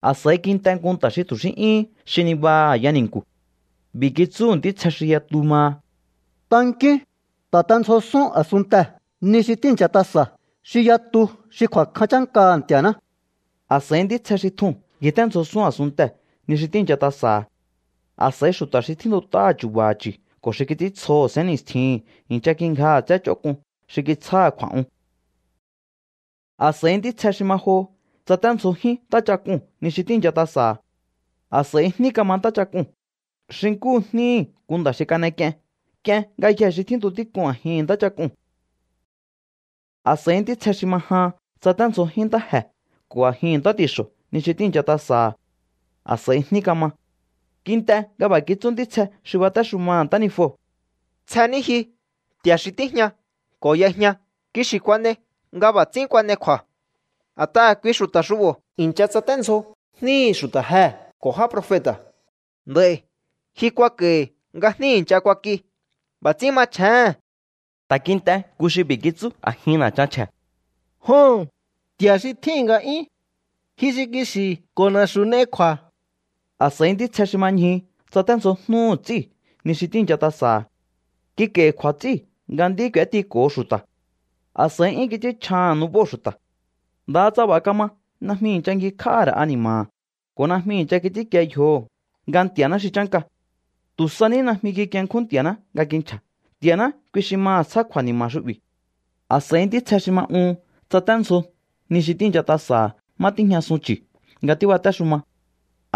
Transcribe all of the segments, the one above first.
A̱s'a̱i kint'e nku nta̱ xi tu̱ xí 'yúhún xi nibaha a̱ya ni̱nku̱. B'i̱ kitsúhu̱ ntítsje xi yatu maha: —Tankíún. Ta̱tendzjosún a̱sunntee̱ ni xi tíi̱ncha tasa̱ xi yatu xi kju̱a̱kjan chánkaha̱ Nti̱a̱ná. A̱s'a̱i ntítsje xi tjuu̱n ngjiténdzjosún a̱sunntee̱ ni xi tíi̱ncha tasa̱ha̱. A̱s'a̱i xu̱ta̱ xi tjíntut'áha̱ chu̱ba̱ha̱ chu̱ ko̱ xi kits'íntsjoho̱ sénni̱stjihi̱n i̱ncha kingjaha̱ tsé ch'onk'un xi kitsjáha̱ kju̱a̱'un. A̱s'a̱i ntítsje xi ma joho tsaténdzjojín ntáchak'uu̱n ni xi tíi̱ncha tasa̱ha̱. A̱s'a̱i jní kama ntáchak'uu̱n xi nkúhu jníhi̱ nku nda̱ xi kan'ek'ien. K'ien ngayjee̱ xi tjíntu tík'un a̱jin ntáchak'uu̱n. A̱s'a̱i ntítsje xi ma jahan tsaténdzjojín ntáje̱ ko̱ a̱jin ntá ti̱xo̱ ni xi tíi̱ncha tasa̱ha̱. A̱s'a̱i jní kama. Kint'e nga b'a̱ kitsú ntítsje xi batéxumaha̱ ntánijuo̱: —Tsje ní ji, Nti̱a̱ xi tíjña ko̱ y'ejña. Kixi̱ kuan'ei nga b'a̱ ts'ín kuan'ei kju̱a̱. A̱t'aha̱ kui xu̱ta̱ xu'bo̱ i̱ncha tsaténdzjo jníhi̱ xu̱ta̱ jee̱ ko̱ já profeta̱. Nd'a̱i̱ ji kuak'a̱i̱hi̱ nga jní i̱ncha kuak'i. B'a̱ ts'ín machjéhe̱n. Ta̱ kint'e nku xi b'i̱ kitsú a̱jin na̱chan chje̱: —Joho̱n, Nti̱a̱ xi tjíhi̱n nga'yún, ji xi kixi̱ ko̱ na̱xu̱ n'ei kju̱a̱. A̱s'a̱i ntítsje xi ma ñjuhu tsaténdzjojnúhu̱ ts'íu̱ ni xi tíi̱ncha tasa̱ha̱. Kik'a̱i̱hi̱ kju̱a̱ ts'íu̱ nga nd'í k'u̱étiko̱ho xu̱ta̱. A̱s'a̱i 'yún kits'ínchjaha̱n nubóo̱ xu̱ta̱. Ndaha tsa b'a̱ kama, najmi i̱ncha ngjikj'áhá ra̱ ani̱ma̱ha̱ ko̱ najmi i̱ncha kits'ínkie yjoho̱ nga Nti̱a̱ná xi chánka. Tu̱ sa ní najmi kikienkjún Nti̱a̱ná nga kinchja̱. Nti̱a̱ná, kui xi maha̱ tsjá kju̱a̱ni̱ma̱ xu'bi̱. A̱s'a̱i ntítsje xi ma uhun tsaténdzjo ni xi tíi̱ncha tasa̱ha̱ má tíjñasun chu̱ nga tíbatéxuma.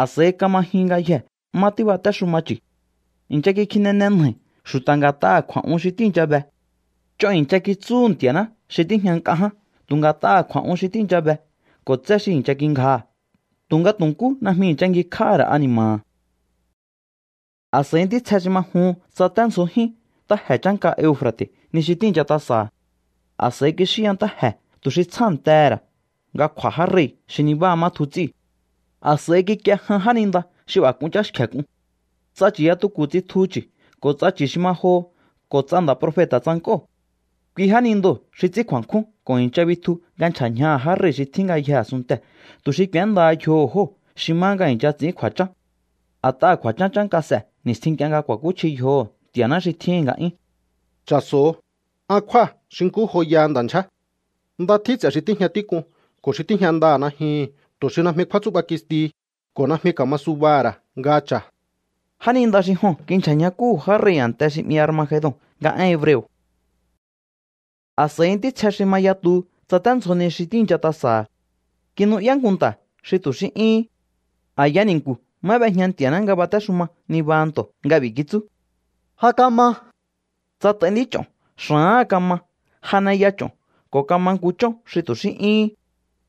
A̱s'a̱i kama jyun ngayjee̱ má tíbatéxuma chu̱. I̱ncha kikjinene nja̱i̱ xu̱ta̱ nga̱t'aha̱ kju̱a̱'un xi tíi̱ncha be. Ch'on i̱ncha kitsúhu̱ Nti̱a̱ná xi tíjña nk'a ján tu̱ nga̱t'aha̱ kju̱a̱'un xi tíi̱ncha be ko̱ tsé xi i̱ncha kingjaha̱, tu̱nga tu̱ nkú najmi i̱ncha ngjikj'áhá ra̱ ani̱ma̱ha̱. A̱s'a̱i ntítsje xi ma juhun tsaténdzjojín ntáje̱ chánka Eufra̱te̱ ni xi tíi̱ncha tasa̱ha̱. A̱s'a̱i kixíya ntáje̱ tu̱ xi tsjántehe̱ ra̱ nga kj'u̱a̱ já rei̱ xi nibáha má tju ts'íu̱. A̱s'a̱i kikie jan jáninda xi b'a̱ k'un cháxkje̱ k'un. Ts'a chu̱yatuku̱ tsitju chu̱ ko̱ ts'a chu̱ xi ma joho ko̱ ts'a nda̱ profeta̱ tsank'óo̱. Kui jánindoo̱ xi ts'ín kju̱a̱nkjún ko̱ i̱ncha bitju nga nchja̱ ñjaha̱ já rei̱ xi tjín ngayjee̱ a̱sunntee̱, tu̱ xi k'u̱éndaha yjoho̱ jóo̱ xi má nga i̱ncha ts'i̱ín kju̱a̱chán. A̱t'aha̱ kju̱a̱chán chánka s'e̱ ni̱stjin nk'ie nga ku̱a̱kúchji yjoho̱ Nti̱a̱ná xi tjíhi̱n nga'yún. “Cha̱so̱o, an kjúa̱ xi nkú joyaha nda̱ ndyjé. ¡Nda tjín ts'e̱ xi tíjña tík'un ko̱ xi tíjña ndaha̱ najyuhu̱n tu̱ xi najmi kjúátsú'ba kistihi ko̱ najmi ka̱ma subaha̱ ra̱ nga cha̱!” Jáninda xi joo̱n kinchja̱ ñjakúhu̱ já rei̱ a̱nte xi 'mi Armagedon nga én hebreo̱. A̱s'a̱i ntítsje xi ma yatuhu tsaténdzjo ni xi tíi̱ncha tasa̱ha̱. Kinu'yá nku nta̱ xi tu̱ xí 'yúhún. A̱ya ni̱nku̱ má b'ejña Nti̱a̱ná nga batéxuma nibaha nto̱ nga b'i̱ kitsú: —Ja kama. Tsat'ai nd'ích'o̱n, xa̱áha̱n kama, janeya ch'o̱n, ko̱ kama nku chón xi tu̱ xí 'yúhún.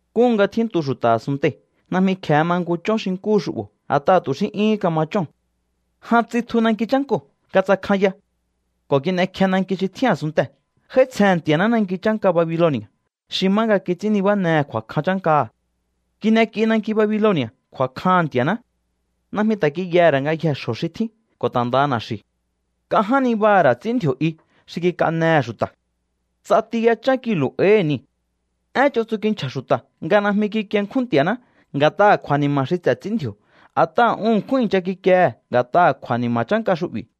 Nkúhu nga tjíntu xu̱ta̱ a̱sunntei̱ najmi kje̱e ma nku chón xi nkúhu xu'bo̱, a̱t'aha̱ tu̱ xí 'yúhún kama chóo̱n. Jan tsitju nanki chánkoo̱ nga tsakjanya ko̱ kin'ekje nanki xi tjín a̱sunntee̱. J'áítsjehe̱n Nti̱a̱ná nanki chánka Babiloni̱a̱ xi má nga kits'ín nibánehe̱ kju̱a̱kjan chánkaha̱. Kin'ek'i nanki Babiloni̱a̱ kju̱a̱kjaha̱n Nti̱a̱ná. Najmi ta̱ kiyaha̱ ra̱ ngayjee̱ xjo̱ xi tjín ko̱ ta̱ ndaha na̱xi̱u̱. Nk'a ján nibaha̱ ra̱ ts'í ndji̱o̱ i xi kik'anehe̱ xu̱ta̱. Ts'ati yachán kilu̱ áíhi̱ niu̱. Én ch'on tsu kinchja̱ xu̱ta̱ nga najmi kikienkjún Nti̱a̱ná nga̱t'aha̱ kju̱a̱ni̱ma̱ xi ts'e̱ ts'í ndji̱o̱, a̱t'aha̱ un ṉkjún i̱ncha kikiehe̱ nga̱t'aha̱ kju̱a̱ni̱ma̱ chánka xu'bi̱.